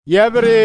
Yɛbr ɩ,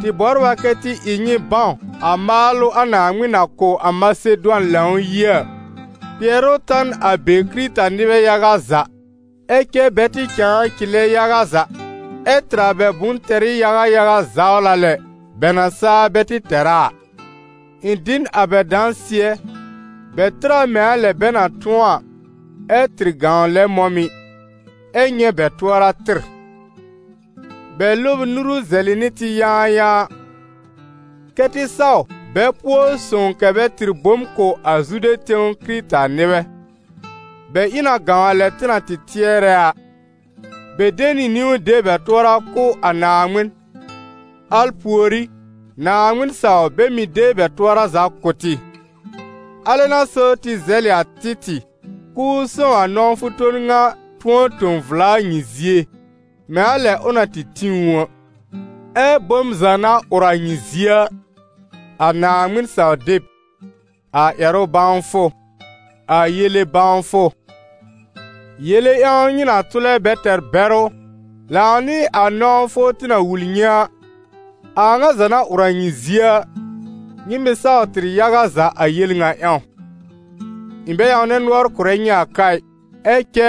tɩ bɔbr a kɛ tɩ ɩ nyɩ bãw a maalʋ a Naaŋmɩn na kʋ̀ a Masedʋan Lãw-yie a. Kpɩɛrʋ ta n a be Kɩrɩta-nɩbɛ yaga za, ɛ cɛ bɛ tɩ cãa cɩlɛ yaga za ɛ́ tɩr a bɛ bʋ̃-tɛrɩ yaga yaga zawla lɛ, bɛ na saa bɛ tɩ tɛr a a. Ɩ̃ dɩ n a bɛ dãsɩɛ, bɛ tɩr a mɛ̃ a lɛ bɛ na tʋ̃ɔ a, ɛ́ tɩr gãw lɛ mɔ̃ mɩ̀, ɛ́ nyɛ̃ bɛ tʋɔra tɩr. Bɛ lɔb ɩ nuru zɛlɩ nɩ tɩ yãayãa, kɛ́ tɩ saw bɛ pʋɔ sõw kɛ̀ bɛ tɩr bom kʋ̀ a Zude tẽw Kɩrɩta-nɩbɛ. Bɛ ɩ na gãw a lɛ tɩ na tɩ tɩɛrɛ a: bɛ de nɩ niwn de bɛ tʋɔra kʋ̀ a Naaŋmɩn, al pùorí, Naaŋmɩn saw bɛ mɩ́ de bɛ tʋɔra za kʋ̀ tɩ. Alɛ n'a so tɩ zɛlɩ a Títɩ̀ k'ʋʋ sõw a nɔ̃wfʋ ton ŋa tʋ̃ɔ tõ vla a nyɩ zie, mɛ̃ a lɛ ʋ na tɩ tĩ ʋ a. Ɛ́ bom za na ʋr a nyɩ zie a: a Naaŋmɩn saw-deb, a ƴɛrʋ bãwfʋ, a yele-bãwfʋ, yele ƴãw nyɩ na tʋlɛ bɛ tɛr bɛrʋ, lãw nɩ a nɔ̃wfʋ tɩ na wul nyɩ a, a a ŋa za na ʋr a nyɩ zie a, nyɩ mɩ̀ saw tɩr yaga za a yel ŋa ƴãw. Ɩ̃ bɛ ƴãwnɛ nʋɔr kʋ̀rɛ nyɩ a ka ɩ, ɛ cɛ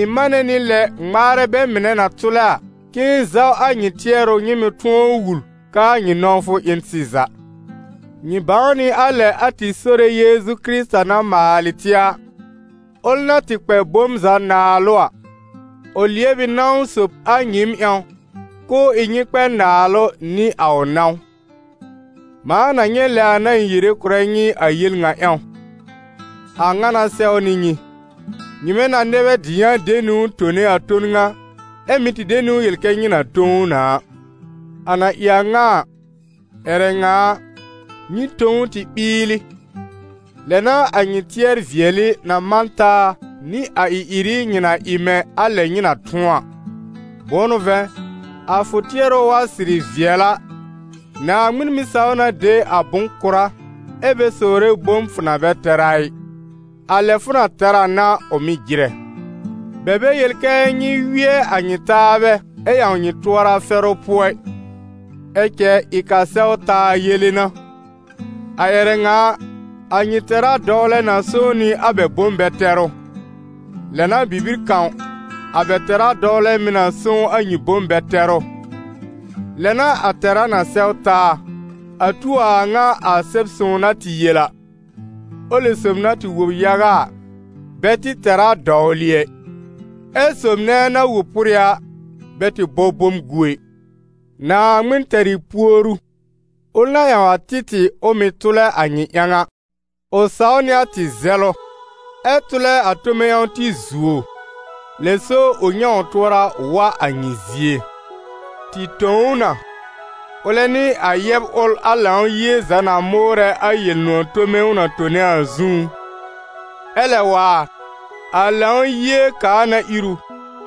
ɩ̃ manɛ nɩ lɛ ŋmaarɛ bɛ mɩnɛ na tʋlɛ a, k'ɩ̃ɩ zaw a nyɩ tɩɛrʋ nyɩ mɩ̀ tʋ̃ɔ wul k'aa nyɩ nɔ̃wfʋ ɩ n sɩza. Nyɩ bãw nɩ a lɛ a tɩ Sore Yeezu Kɩrɩta na maalɩ tɩ a, ʋl na tɩ kpɛ bom za naalʋ a, ʋ lɩɛb ɩ nãw sob a nyɩɩm ƴãw, k'ʋʋ ɩ nyɩ kpɛ naalʋ nɩ a ʋ nãw. Mãa na nyɛ̃ lɛ a n'a ɩ̃ yere kʋ̀rɛ nyɩ a yel ŋa ƴãw: a ŋa n'a sɛwnɩ nyɩ, nyɩmɛ na nɛ bɛ dɩyã de niwn tone a ton ŋa, ɛ́ mɩ̀ tɩ de niwn yel kɛ nyɩ na tõ ʋ na a. A na ɩ a ŋa a, ƴɛrɛ ŋa a, nyɩ tõ ʋ tɩ ɓɩɩlɩ, lɛ n'a a nyɩ tɩɛr-vɩɛlɩ na man taa nɩ a ɩ-ɩrɩ nyɩ na ɩ mɛ̃ a lɛ nyɩ na tʋ̃ɔ a. Bʋ̃ʋ n'ʋ vɛ̃, a fʋ tɩɛrʋ wa sɩrɩ vɩɛl a, Naaŋmɩn mɩ́ saw na de a bʋ̃-kʋra ɛ́ bɛ sowre bom fʋ na bɛ tɛr a ɩ, a lɛ fʋ na tɛr a n'a ʋ mɩ́ jɩrɛ. Bɛ bɛ yel kɛ nyɩ wɩɛ a nyɩ taabɛ ɛ ƴãw nyɩ tʋɔra fɛrʋ pʋɔ ɩ, ɛ cɛ ɩ k'a sɛw taa yele n'a. A ƴɛrɛ ŋa a, a nyɩ tɛra dɔwlɛ na sõw nɩ a bɛ bom-bɛ-tɛrʋ; lɛ n'a bibir kãw, a bɛ tɛra dɔwlɛ mɩ̀ na sõw a nyɩ bom-bɛ-tɛrʋ, lɛ n'a a tɛra na sɛw taa, a tu a a ŋa a Sɛb-sõw na tɩ yel a: «Ʋlɩ sob na tɩ wob yaga a, bɛ tɩ tɛr a dɔwlɩ ɛ, ɛ́ sob nɛ na wob pʋrɩ a, bɛ tɩ bɔ bom gu ɛ.» Naaŋmɩn tɛr ɩ puoru, ʋl na ƴãw a Títɩ̀ ʋ mɩ̀ tʋlɛ a nyɩ ƴãw a. Ʋ saw nɩ a tɩ zɛlʋ, ɛ tʋlɛ a tome ƴãw tɩ zuo, lɛ so ʋ nyɛ̃ ʋ tʋɔra wa a nyɩ zie. Tɩ tõ ʋ na, ʋlɛ nɩ a yɛb ʋl a Lãw-yie za na mʋʋrɛ a Yel-nʋ̃ɔ̀ tome ʋ na tone a zũú. Ɛ lɛ waar, a Lãw-yie kaa na ir ʋ,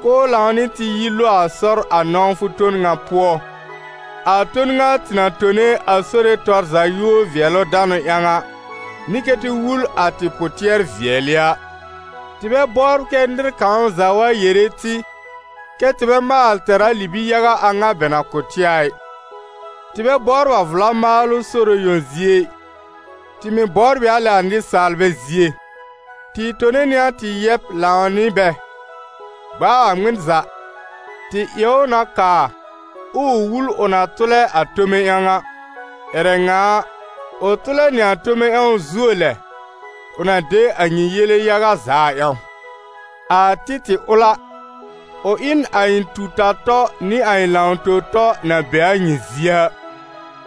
k'ʋʋ lãw nɩ tɩ yi lo a sɔr a nɔ̃wfʋ ton ŋa pʋɔ, a ton ŋa tɩ na tone a Sore tɔr za yúor-vɩɛlʋ-danʋ ƴãw a, nɩ kɛ́ tɩ wul a tɩ pʋ-tɩɛr-vɩɛlɩ a. Tɩ bɛ bɔbr kɛ́ nɩr kãw za wa yere tɩ, kɛ́ tɩ bɛ maal tɛr a libi-yaga a ŋa bɛ na kʋ̀ tɩ a ɩ. Tɩ bɛ bɔbr a vla maalʋ Sore yõ zie ɩ, tɩ mɩ̀ bɔbr ɩ a lɛ a nɩsaalbɛ zie. Tɩ tone nɩ a tɩ yɛb lãw nɩ bɛ; gb'a a ŋmɩn za, tɩ ɩ ʋ na kaa, ɛ ʋ wul ʋ na tʋlɛ a tome ƴãw a. Ƴɛrɛ ŋa a, ʋ tʋlɛ nɩ a tome ƴãw zuo lɛ, ʋ na de a nyɩ yele yaga za a ƴãw. A Títɩ̀ ʋl a, ʋ ɩ n a ɩ̃ tu-ta-tɔ nɩ a ɩ̃ lãw-tõ-tɔ na be a nyɩ zie a;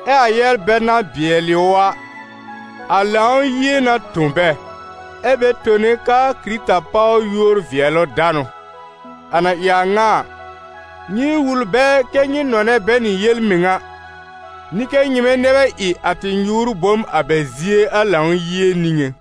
ɛ a yɛbr bɛl na bɩɛlɩ ʋ a, a Lãw-yie n'a tõ bɛ, ɛ́ bɛ tone k'aa Kɩrɩta páw yúor-vɩɛlʋ-danʋ. A na ɩ a ŋa a, nyɩ wul bɛ kɛ́ nyɩ nɔnɛ bɛ nɩ yel-mɩŋa, nɩ kɛ́ nyɩmɛ nɛ bɛ ɩ a tɩ nyʋʋr-bom a bɛ zie a Lãw-yie niŋé.